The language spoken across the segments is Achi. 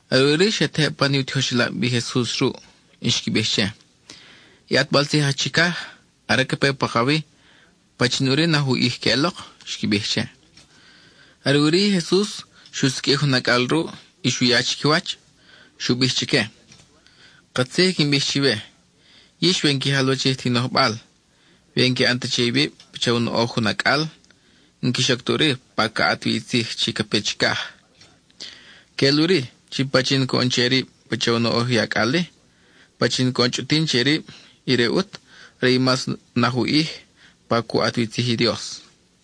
Are ʼuri xe tejeb pan i u tijoxelab i Jesus ruʼ, y xqui bij che: —I ʼatbal tzij aj chicaj, are ca pe pakawi, ¿pachin ʼuri naj u ʼij queʼelok? —xqui bij che. Are ʼuri i Jesus xu siqʼuij jun acʼal ruʼ, y xu ya chiquiwach. Xu bij chique: —Katzij i quin bij chiwe: yix we n-qui jalwachij ta i nojbal, we n-qui ʼan ta che iwib pacha u noʼoj jun acʼal, n-quix oc ta ʼuri pa ca ʼat wi i tzij chi ca pe chicaj. Queʼel ʼuri chi pachin coʼon che rib pacha u noʼoj i acʼal-i, pachin coʼon chʼutin che rib, ire ʼut are i mas naj u ʼij pa cu ʼat wi tzij i Dios.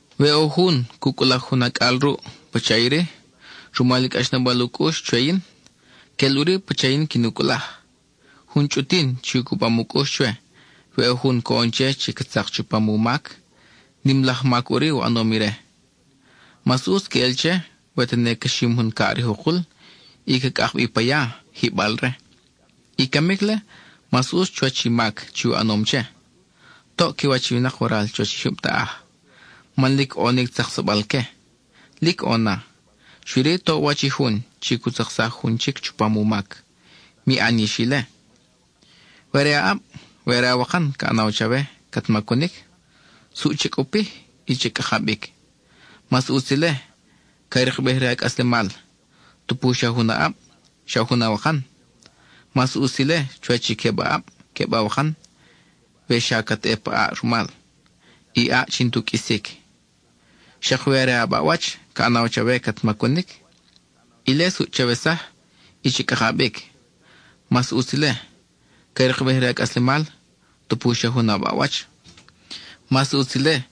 We ʼo jun cu cʼulaj jun acʼal ruʼ pacha iri, rumal i cʼaxnabal u cʼux chwe yin, quel ʼuri pacha yin quin u cʼulaj. Jun chʼutin chi u cubam u cʼux chwe, we ʼo jun coʼon che chi ca tzak chupam u mac, nim laj mac ʼuri u ʼanom ire. Mas ʼutz queʼel che, we tene ca xim jun caʼ rij u kul y ca cʼak bi pa ya, jiʼbal-re. I camic-le, mas ʼutz chuwach i mac chi u ʼanom che. ¡Toʼ qui wach i winak waral chuwach i jyub taʼaj, man lic ʼo ni tzaksabal-que! Lic ʼo na; xui-ri toʼ u wach i jun chi cu tzaksaj jun chic chupam u mac. ¡Mi ʼan yix ile! We are a ʼab, we are awakan ca ʼanaw chawe cat macunic, suʼ cha cʼupij y cha cʼaka bic. Mas ʼutz ile, ca rikbej re a cʼaslemal, tupu xa jun a ʼab, xa jun awakan. Mas ʼutz ile chuwach i queb a ʼab, queb awakan we xa cat ʼe pa ʼaʼ rumal, i ʼaʼ chi n-tu qʼuisic. Xak we are a baʼwach ca ʼanaw chawe cat macunic, ile suʼ chawesaj y cha cʼaka bic. Mas ʼutz ile, ca rikbej re a cʼaslemal, tupu xa jun a baʼwach. Mas ʼutz ile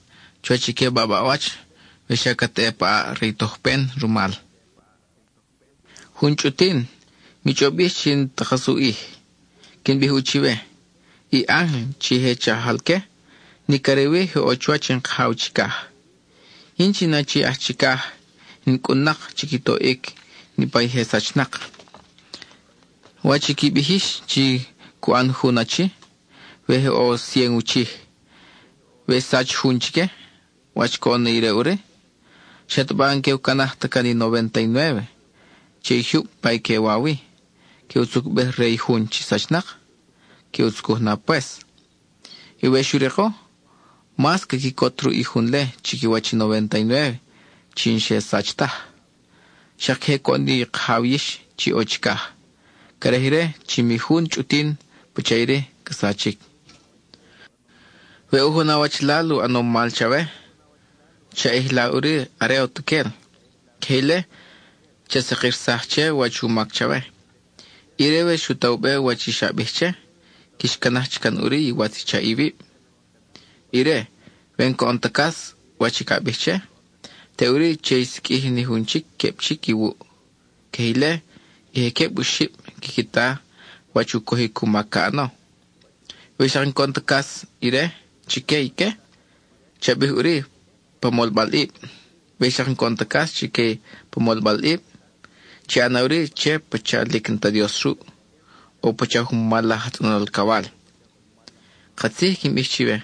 chuwach i queb a baʼwach we xa cat ʼe pa ʼaʼ re i tojpen rumal. Jun chʼutin, mi chʼob yix chi n-ta kas u ʼij. Quin bij ʼu chiwe, i ángel chi je chajal-que nic are wi je ʼo chuwach in Kajaw chicaj. Yin chi in Achi aj Chicaj in cʼun-nak chi qui toʼic niʼpa i je sachnak. ¿Wach i qui bij yix chi cu ʼan jun achi, we je ʼo cien u chij, we xsach jun chique? ¿Wach coʼon na ire ʼuri? ¿Xataba n-que u canaj ta can i novénta y nuéve che i jyub pa i que wa wi, que u tzucbej re i jun chi sachnak? Que u tzucuj na pues. Y we xu riko, mas ca quicot ruʼ i jun-le chiquiwach i novénta y nuéve chi n-xe sach taj. Xak queje coʼon i Kajaw yix chi ʼo chicaj. Craj ire chi mi jun chʼutin pacha iri ca sachic. We ʼo jun awachalal u ʼanom mal chawe, cha ʼijla ʼuri are utuquel; queje ile cha sakirsaj che wach u mac chawe. Ire, we xu ta u be wach i xa bij che, quix canaj chic can ʼuri iwatz i chaʼ iwib. Ire, we n-coʼon ta cas wach i ca bij che, teʼuri che i siqʼuij ni jun chic, queb chic, iwuʼ. Queje ile i je queb oxib quiqui ta wach u cojic u mac ca ʼano. We xak n-coʼon ta cas ire chique ique, cha bij ʼuri pa molbalʼib. We xak n-coʼon ta cas chique pa molbalʼib, chi ʼana ʼuri che pacha lic n-ta Dios ruʼ, o pacha jun mal laj aj tzʼonol alcawal. Katzij i quin bij chiwe: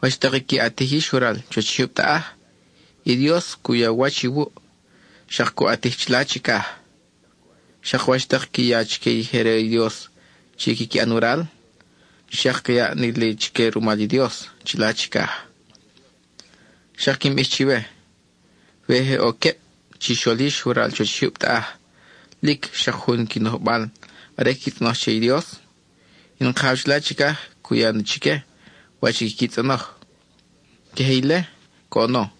wach tak i qui ʼatij yix waral chuwach i jyub taʼaj, i Dios cu ya u wach iwuʼ, xak cu ʼatij chila chicaj. Xak wach tak qui ya chique i je re i Dios chi quiqui ʼan waral, xak ca yaʼ na li chique rumal i Dios chila chicaj. Xak quin bij chiwe: we je ʼo queb chixol yix waral chuwach i jyub taʼaj lic xak jun i qui nojbal are quiqui tzʼonoj che i Dios, in Kajaw chila chicaj cu ya na chique wach i quiqui tzʼonoj. Queje ile coʼono,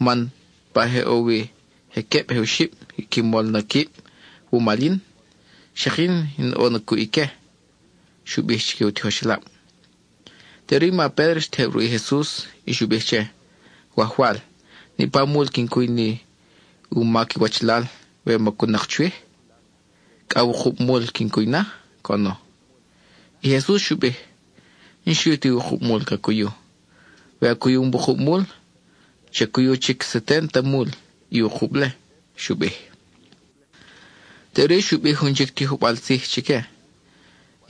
man pa je ʼo wi je queb je oxib qui molom na quib wumal yin, xak yin in ʼo na cuʼ ique —xu bij chique u tijoxelab. Teʼuri i ma Pédro xtejeb ruʼ i Jesus y xu bij che: —Wajwal, ¿niʼpa mul quin cuy ni u mac i wachalal we macun-nak chwij? ¿Cʼa wukub mul quin cuy na? —coʼono. I Jesus xu bij: —N-xui ti wukub mul ca cuyu. We a cuyum wukub mul, cha cuyu chic seténta mul i wukub-le —xu bij. (Teʼuri xu bij jun chic tijojbal tzij chique):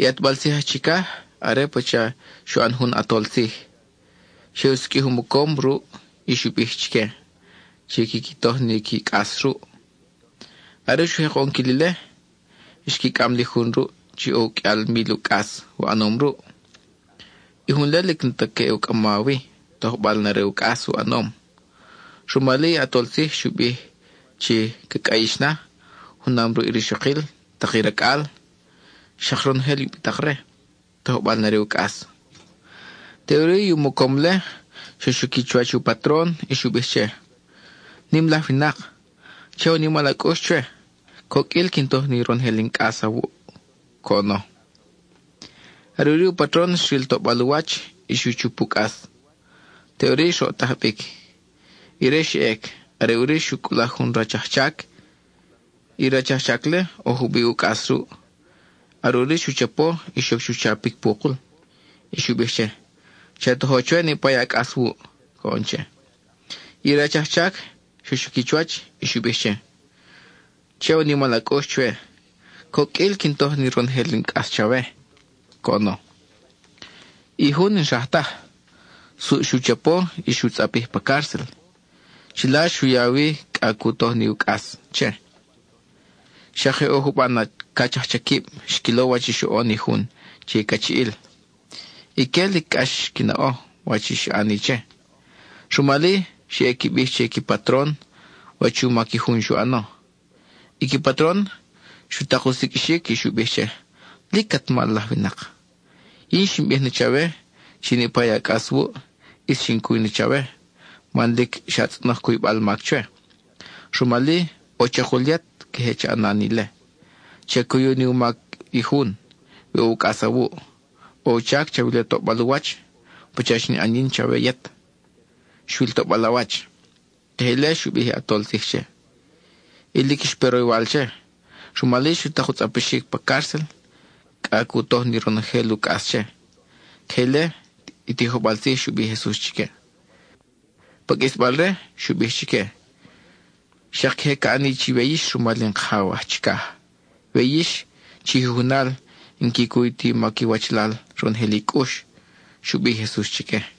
—I ʼatbal tzij aj chicaj are pacha xu ʼan jun ʼatol tzij; xe u siqʼuij u mocom ruʼ y xu bij chique chi quiqui toj ni qui cʼas ruʼ. Are xu jek u ʼonquil ile, xqui cʼam li jun ruʼ chi ʼo uqʼuial mil u cʼas u ʼanom ruʼ. I jun-le lic n-ta ca ʼe u cʼama wi, tojbal na re u cʼas u ʼanom. Rumal-i, i ʼatol tzij xu bij chi ca cʼayix na, junam ruʼ i rixokil, tak i racʼal, xak ronojel i ubitak-re, tojbal na re u cʼas. Teʼuri i u mocom-le xa xuqui chuwach u patron y xu bij che: “Nim laj winak, cha ya u nimal a cʼux chwe; coqʼuil quin toj ni ronojel in cʼas chawe,” coʼono. Are ʼuri u patron xril toʼbal u wach, y xu chup u cʼas; teʼuri xroʼtaj bic. Ire xa ʼec; are ʼuri xu cʼulaj jun rach ajchac. I rach ajchac-le, ʼo jubiʼ u cʼas ruʼ; are ʼuri xu chapo y xoc chu chapic pu kul, y xu bij che: “Cha tojo chwe niʼpa a cʼas wuʼ,” coʼon che. I rach ajchac xa xuqui chuwach y xu bij che: “Cha ya u nimal a cʼux chwe; coqʼuil quin toj ni ronojel in cʼas chawe,” coʼono. I jun n-xraj taj; suʼ xu chapo y xu tzʼapij pa cárcel. Chila xu ya wi cʼa cu toj ni u cʼas che. Xak je ʼo juban cach ajchaquib xquilo wach xoʼon i jun che i cachiʼil. Ique lic cʼax xqui naʼo wach i xa ʼani che. Rumal-i, xe ʼe qui bij che i qui patron wach u mac i jun xu ʼano. I qui patron xu tak u siqʼuixic, y xu bij che: “¡Lic at mal laj winak! Yin xin bij na chawe chi niʼpa i a cʼas wuʼ, ʼis xin cuy na chawe, man lic xa tzʼonoj cuybal mac chwe. Rumal-i, ʼo chakul yet queje cha ʼana ni ile, cha cuyu ni u mac i jun we ʼo u cʼas awuʼ. ʼO u chac chawila toʼbal u wach, pacha xin ʼan yin chawe yet, xwil toʼbal a wach.” Queje ile xu bij i ʼatol tzij che. Y lic xpe roywal che. Rumal-i, xu tak u tzʼapixic pa cárcel, cʼa cu toj ni ronojel u cʼas che. (Queje ile i tijojbal tzij xu bij i Jesus chique.) Pa qʼuisbal-re xu bij chique: —Xak queje ca ʼani chiwe yix rumal in Kajaw aj chicaj, we yix chi jujunal n-qui cuy ti qui mac iwachalal ronojel i cʼux —xu bij i Jesus chique.